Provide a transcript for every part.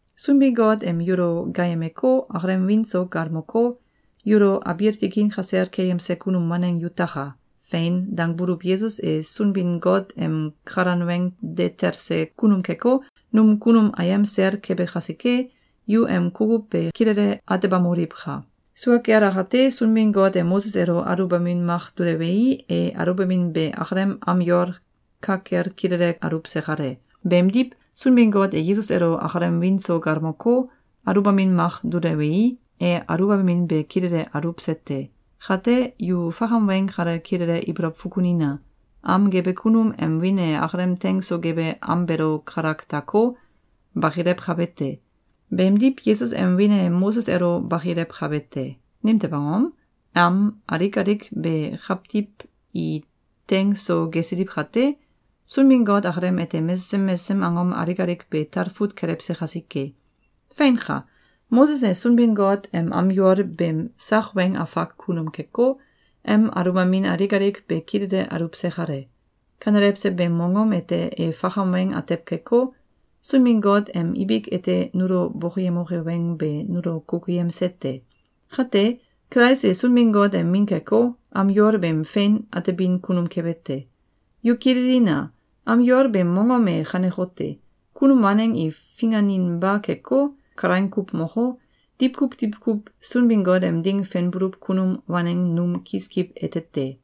Sunbin-Got em yulo gaayemeko, akalem wiin so galmoko, yulo abiil tikin kasel keyemse kunum waneng yutaka! “Fein!”, dangbuluw Yesus e Sunbin-Got em kalan weng de telse kunum keko, num kunum ayem sel kebe kasike, yu em kukuw be kilele atebamoliwka! Sua kel akate, Sunbin-Got e Moses elo aluwbamin mak dulewei, e aluwbamin be akalem am yol ka kel kilele aluwse kale. Beemdiw, Sunbin-Got e Yesus elo akalem wiin so galmoko, aluwbamin mak dulewei, e aluwbamin be kilele aluwse te. Kate, yu fakam weng kale kilele ibolow fukunina! Am gebe kunum em wiin e akalem teing so gebe am beelo kalak dako, bakilewkabe te. Beemdiw, Yesus em wiin e Moses elo bakilewkabe te. Nimtew angom? Am alik alik be kawtiw i teing so gesiliw kate, Sunbin-Got akalem ete mesesem mesesem angom alik alik be talfut kelewse kasike. Feinka! Moses e Sunbin-Got em am yol beem sak weng afak kunum keko, em aluwbamin alik alik be kilele aluwse kale. Kanelewse beem mongom ete e fakam weng atew keko, Sunbin-Got em ibik ete nulo bokoyemoke weng be nulo kukuyemse te. Kate, Kulais e Sunbin-Got em Min keko, am yol beem fein atebin kunum kebe te. Yu kililina! Am yol beem mongom e kanekote: Kunum waneng i finganinba keko, kalaing kuw moko, diwkuw diwkuw Sunbin-Got em ding fenbuluw kunum waneng num kiskiw ete te.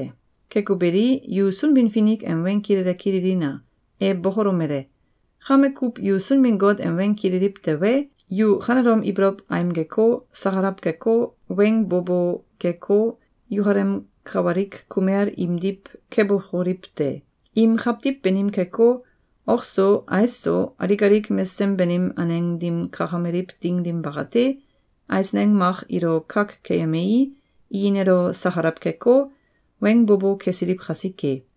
Keko beli, yu Sunbin-Finik em weng kilele kililina! E bokolomele: “Kame kuw yu Sunbin-Got em weng kililiw tewe, yu kanelom ibolow aimgeko, sakalaw keko, weng bo bo keko, yukalem kawalik kumel imdiw kebokoliw te! Im kawtiw banim keko, ok so, ais so, alik alik mesesem banim aneng dim kakameliw ding dim bakate, eisneng mak ilo kak keyemei, i nelo sakalaw keko, weng bo bo kesiliw kasike.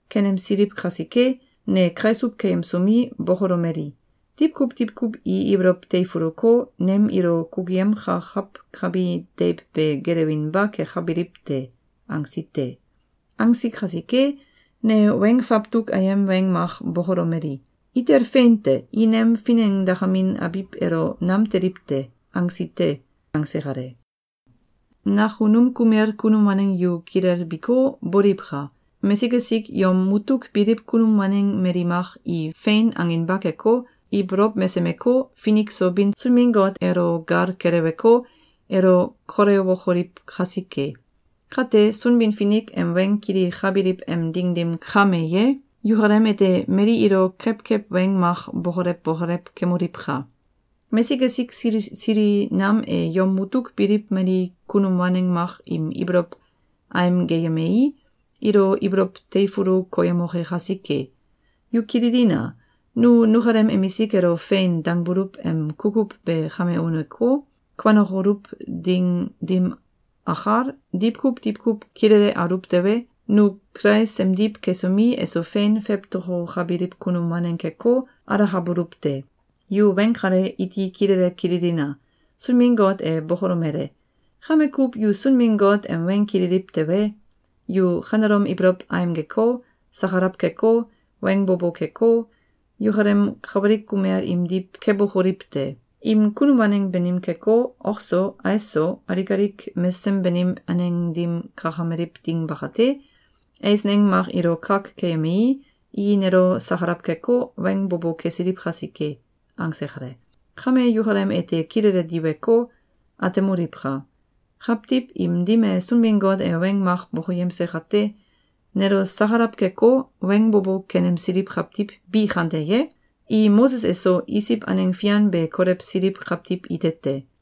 Kenemsiliw kasike, ne kaisuw keyemsomi, bokolomeli: ‘Diwkuw diwkuw i ibolow teifuluko, nem ilo kukuyemkakawkabi deiw be gelewinba kekabiliw te!’, angsi te. Angsi kasike, ne weng fawtuk ayem weng mak bokolomeli: ‘Itel fein te! I nem finengdakamin abiw elo nam teliw te!’, angsi te.”, angse kale. Nakunum kumel kunum waneng yu kilelbiko, boliwka! Mesik esik yom mutuk biliw kunum waneng mali mak i “Fein!”, anginba keko, ibolow mesemeko, finik so bin Sunbin-Got elo gal keleweko, elo kolewokoliw kasike. Kate, Sunbin-Finik em weng kilikabiliw em ding dim kame ye, yukalem ete mali ilo kewkew weng mak bokolew bokolew kemoliwka! Mesik esik sili sili nam e yom mutuk biliw mali kunum waneng mak im ibolow aimgeyemei, ilo ibolow teifulu koyemoke kasike. Yu kililina! Nu nukalem emisik elo “Fein!”, dangbuluw em kukuw be kame uneko, kuanokoluw ding dim akal, diwkuw diwkuw kilele aluw tewe, nu Kulais emdiw kesomi, eso fein fewtokokabiliw kunum waneng keko, alakabuluw te. Yu weng kale iti kilele kililina! Sunbin-Got e bokolomele: “Kame kuw yu Sunbin-Got em weng kililiw tewe, yu kanelom ibolow aimgeko, sakalaw keko, weng bo bo keko, yukalem kawalik kumel imdiw kebokoliw te! Im kunum waneng banim keko, ok so, ais so, alik alik mesesem banim aneng dim kakameliw ding bakate, eisneng mak ilo kak keyemei, i nelo sakalaw keko, weng bo bo kesiliw kasike.”, angse kale. Kame yukalem ete kilele diweko, atemoliwka! Kawtiw im dim e Sunbin-Got e weng mak bokoyemse kate, nelo sakalaw keko, weng bo bo kenemsiliw kawtiw bi kante ye? I Moses eso Isiw aneng fian be kolewsiliw kawtiw ite te.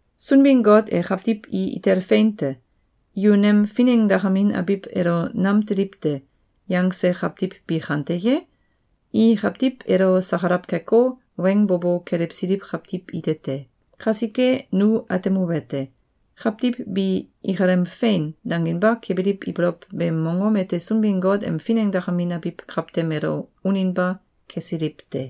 Sunbin-Got e kawtiw i ‘Itel fein te! Yu nem finengdakamin abiw elo nam teliw te!’, yangse kawtiw bi kante ye? I kawtiw elo sakalaw keko, weng bo bo kelewsiliw kawtiw ite te. Kasike nu atemuwete: Kawtiw bi ikalem “Fein!”, danginba kebiliw ibolow beem mongom ete Sunbin-Got em finengdakamin abiw kawtem elo uninba kesiliw te.